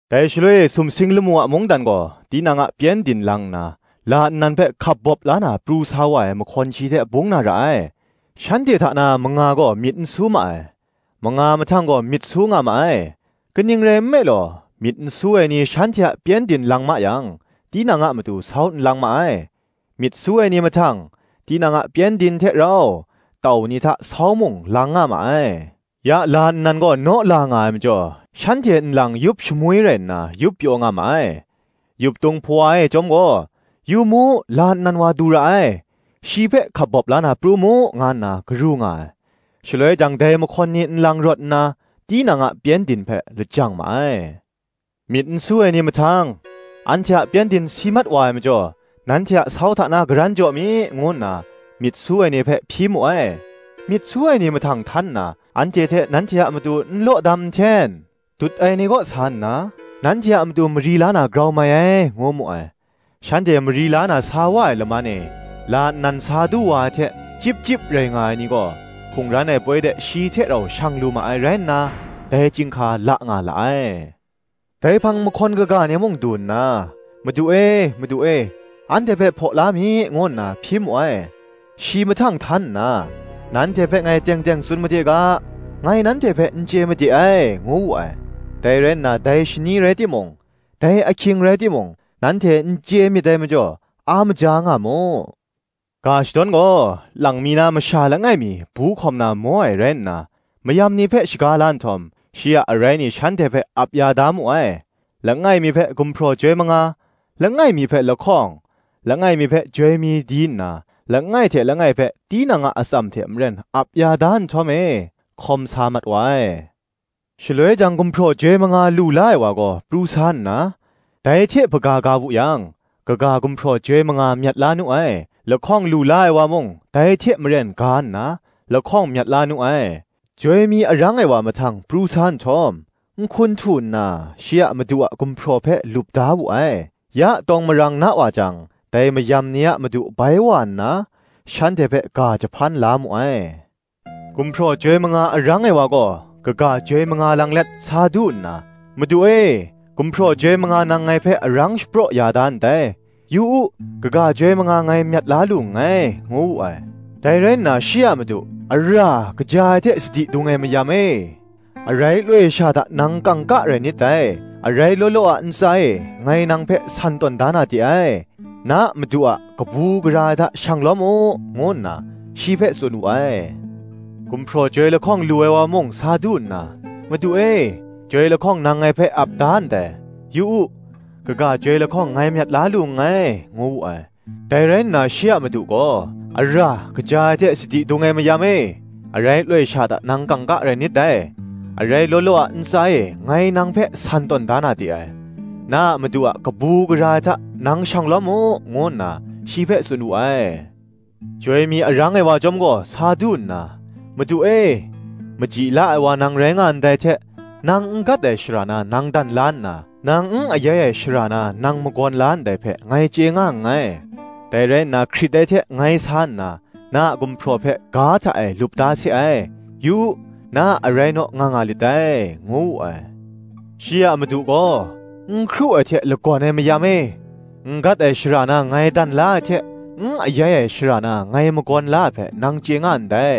Dai shaloi e sumsing lamu a mungdan gaw, tinang a pyengdin lang nna, la nnan hpe hkap bawp la na pru sa wa ai mahkawn shi hte bung na ra ai. Shanhte hta na manga gaw myit n su ma ai; manga mahtang gaw, myit su nga ma ai. Kaning rai nme law, myit n su ai ni shanhte a pyengdin lang ma yang tinang a matu sau n lang ma ai: myit su ai ni mahtang, tinang a pyengdin hte rau, tau ni hta, sau mung lang nga ma ai. Ya la nnan gaw naw la nga ai majaw, shanhte nlang yup shamwi rai nna yup pyaw nga ma ai. Yuptung hpawa e chyawm gaw, Yu mu, la nnan wa du ra ai! shi hpe hkap bawp la na pru mu, nga nna garu nga ai. Shaloi jang dai mahkawn ni nlang rawt nna, tinang a pyengdin hpe lajang ma ai. Myit n su ai ni mahtang, ‘Anhte a pyengdin si mat wa ai majaw, nanhte a sau hta na karan jaw mi,’ ngu nna myit su ai ni hpe hpyi mu ai. Myit su ai ni mahtang htan nna, ‘Anhte hte nanhte a matu n law dam nhten: dut ai ni kaw sa nna, nanhte a matu mari la na grau mai ai,’ ngu mu ai. Shanhte mari la na sa wa ai laman e, la nnan sa du wa ai hte, chyip chyip rai nga ai ni gaw, hkungran ai poi de shi hte rau shang lu ma ai rai nna, dai chyinghka la nga la ai. Dai hpang mahkawn kaga ni mung du nna, Madu e, Madu e, anhte hpe hpaw la mi, ngu nna hpyi mu ai. Shi mahtang htan nna, Nanhte hpe ngai teng teng tsun made ga, ngai nanhte hpe n chye made ai, ngu wu ai. Dai rai na, dai shani rai timung, dai ahkying rai timung, nanhte n chye myit dai majaw, a maja nga mu. Ga shadawn gaw, lang mi na masha langai mi bu hkawm na maw ai rai nna, mayam ni hpe shaga la nhtawm, shi a arai ni shanhte hpe ap ya da mu ai: Langai mi hpe gumhpraw joi manga, langai mi hpe lahkawng, langai mi hpe joi mi di nna, langai hte langai hpe tinang a atsam hte maren ap ya da nhtawm e, hkawm sa mat wa ai. Shaloi jang gumhpraw joi manga lu la ai wa gaw pru sa na, dai hte hpaga ga wu yang, kaga gumhpraw joi manga myat la nu ai. Lahkawng lu la ai wa mung dai hte maren ga nna, lahkawng myat la nu ai. Joi mi arang ai wa mahtang pru sa nhtawm, nhkun htu nna, shi a madu a gumhpraw hpe lup da wu ai. Ya tawng marang na wa jang, dai mayam ni a madu bai wa nna, shanhte hpe ga jahpan la mu ai. Gumhpraw joi manga arang ai wa gaw, kaga joi manga lang let, sa du nna, ‘Madu e gumhpraw joi manga nang ngai hpe arang shapraw ya da ndai; yu u, kaga joi manga ngai myat la lu nngai,’ ngu wu ai. Dai rai nna shi a madu, ‘Ara, kaja ai hte sadi dung ai mayam e: arai loi sha hta nang kangka rai nit dai; arai law law a ntsa e ngai nang hpe san tawn da na de ai: na madu a kabu gara ai hta shang lawm u,’ ngu nna shi hpe tsun wu ai. Gumhpraw joi lahkawng lu ai wa mung sa du nna, ‘Madu e, joi lahkawng nang ngai hpe ap da ndai; yu u, kaga joi lahkawng ngai myat la lu nngai,’ ngu wu ai. Dai rai nna shi a madu gaw, ‘Ara, kaja ai hte sadi dung ai mayam e: arai loi sha hta nang kangka rai nit dai: arai law law a ntsa e ngai nang hpe san tawn da na de ai: na a madu a kabu gara ai hta nang shang lawm u,’ ngu nna shi hpe tsun wu ai. Joi mi arang ai wa chyawm gaw sa du nna, ‘Madu e, maji la ai wa nang rai nga ndai hte, nang n gat ai shara na nang dan la nna, nang n ayai ai shara na nang magawn la ndai hpe ngai chye nga nngai: dai rai nna hkrit ai hte ngai sa nna, na a gumhpraw hpe ga hta e lup da se ai: yu u, na a arai naw nga nga lit dai,’ ngu wu ai. Shi a madu gaw, ‘N hkru ai hte lagawn ai mayam e: n gat ai shara na ngai dan la ai hte, n ayai ai shara na ngai magawn la ai hpe nang chye nga ndai: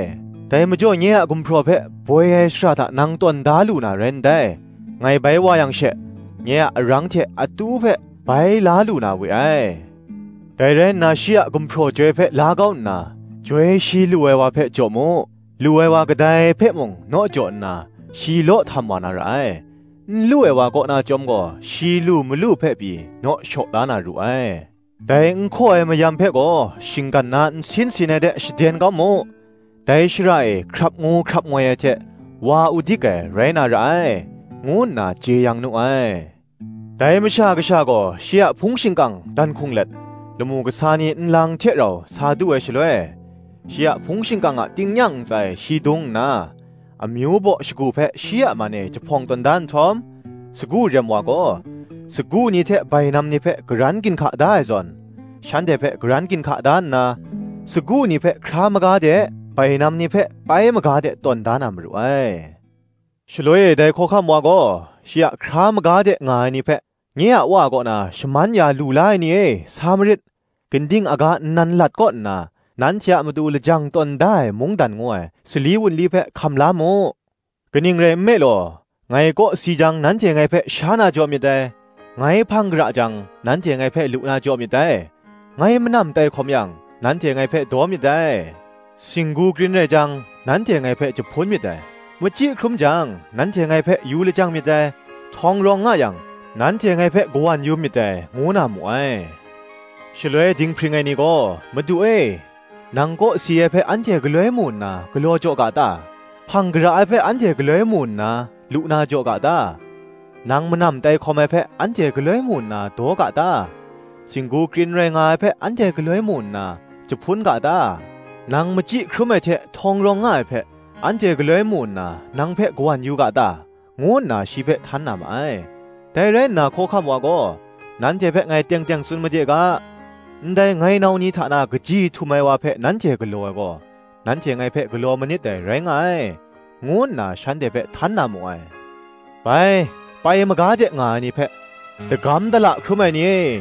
dai majaw nye a gumhpraw hpe boi ai shara hta nang tawn da lu na rai ndai; ngai bai wa yang she, nye a arang hte atu hpe bai la lu na we ai. Dai rai nna shi a gumhpraw joi hpe la kau nna, joi shi lu ai wa hpe jaw mu: lu ai wa kadai hpe mung, naw jaw nna shi law htam wa na ra ai: n lu ai wa kaw na chyawm gaw, shi lu malu hpe pyi naw shaw la na ru ai. Dai n hkaw ai mayam hpe gaw shinggan na nsin sin ai de shaden kau mu: dai shara e hkrap ngu hkrap ngoi ai hte wa udik ai rai na ra ai,’ ngu nna jeyang nu ai. Dai Masha Kasha gaw shi a hpung shingkang dan hkung let, lamu kasa ni nlang hte rau sa du ai shaloi, shi a hpung shingkang a tingnyang ntsa e shi dung nna, amyu baw shagu hpe shi a man e jahpawng tawn da nhtawm, sagu rem wa gaw sagu ni hte bainam ni hpe karan ginhka da ai zawn, shanhte hpe karan ginhka da nna, sagu ni hpe hkra maga de bainam ni hpe pai maga de tawn da na maru ai. Shaloi e dai Hkawhkam wa gaw shi a hkra maga de nga ai ni hpe, “Nye a Wa kaw na shaman ya lu la ai ni e, sa marit; ginding aga nnan lat kaw nna nanhte a matu lajang tawn da ai mungdan ngu ai sali wunli hpe hkam la mu: kaning rai nme law, ngai kawsi jang nanhte ngai hpe sha na jaw myit dai: ngai hpang gara jang, nanhte ngai hpe lu na jaw myit dai: ngai manam tai hkawm yang, nanhte ngai hpe daw myit dai: singgu krin rai jang, nanhte ngai hpe jahpun myit dai: machyi hkrum jang, nanhte ngai hpe yu lajang myit dai; htawng rawng nga yang, nanhte ngai hpe kawan yu myit dai,” ngu na mu ai. Shaloi dinghpring ai ni gaw, “Madu e, nang kawsi ai hpe anhte galoi mu nna galaw jaw ga ta? hpang gara ai hpe anhte galoi mu nna, lu na jaw ga ta? Nang manam tai hkawm ai hpe anhte galoi mu nna, daw ga ta? singgu krin rai nga ai hpe anhte galoi mu nna, jahpun ga ta? Nang machyi hkrum ai hte htawng rawng nga ai hpe, anhte galoi mu nna, nang hpe kawan yu ga ta?” ngu nna shi hpe htan na ma ai. Dai rai nna Hkawhkam wa gaw, “Nanhte hpe ngai teng teng tsun made ga, ‘Ndai ngai nau ni hta na kaji htum ai wa hpe nanhte galaw ai gaw, nanhte ngai hpe galaw manit dai, rai nga ai,’ ngu nna shanhte hpe htan na mu ai. Bai, pai maga de nga ai ni hpe, ‘Dagam dala hkrum ai ni e,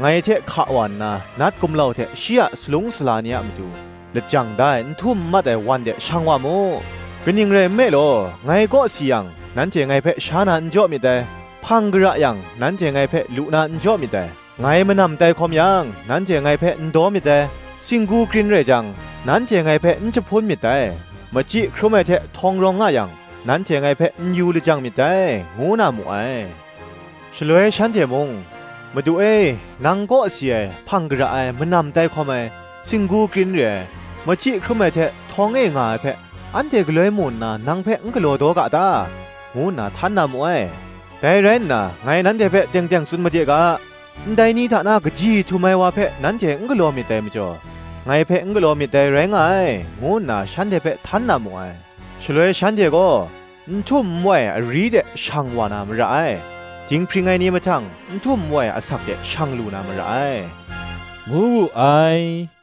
ngai hte hka wa nna nat gumlau hte shi a salung sala ni a matu lajang da ai n htum n mat ai wan de shang wa mu: kaning rai nme law, ngai kawsi yang, nanhte ngai hpe sha na n jaw myit dai; hpang gara yang, nanhte ngai hpe lu na n jaw myit dai: ngai manam tai hkawm yang, nanhte ngai hpe n daw myit dai; singgu krin rai jang, nanhte ngai hpe n jahpun myit dai: machyi hkrum ai hte htawng rawng nga yang, nanhte ngai hpe n yu lajang myit dai,’ ngu na mu ai. Shaloi shanhte mung, ‘Madu e, nang kawsi ai, hpang gara ai, manam tai hkawm ai, singgu krin re ai, machyi hkrum ai hte htawng e nga ai hpe, anhte galoi mu nna, nang hpe n galaw daw ga ta?” ngu nna htan na mu ai. Dai rai nna, Ngai nanhte hpe teng teng tsun made ga, “Ndai ni hta na kaji htum ai wa hpe nanhte n galaw myit dai majaw, ngai hpe n galaw myit dai rai nga ai,” ngu nna shanhte hpe htan na mu ai. Shaloi shanhte gaw n htum n wai ari de shang wa na mara ai; dinghpring ai ni mahtang n htum n wai asak de shang lu na mara ai,” ngu wu ai.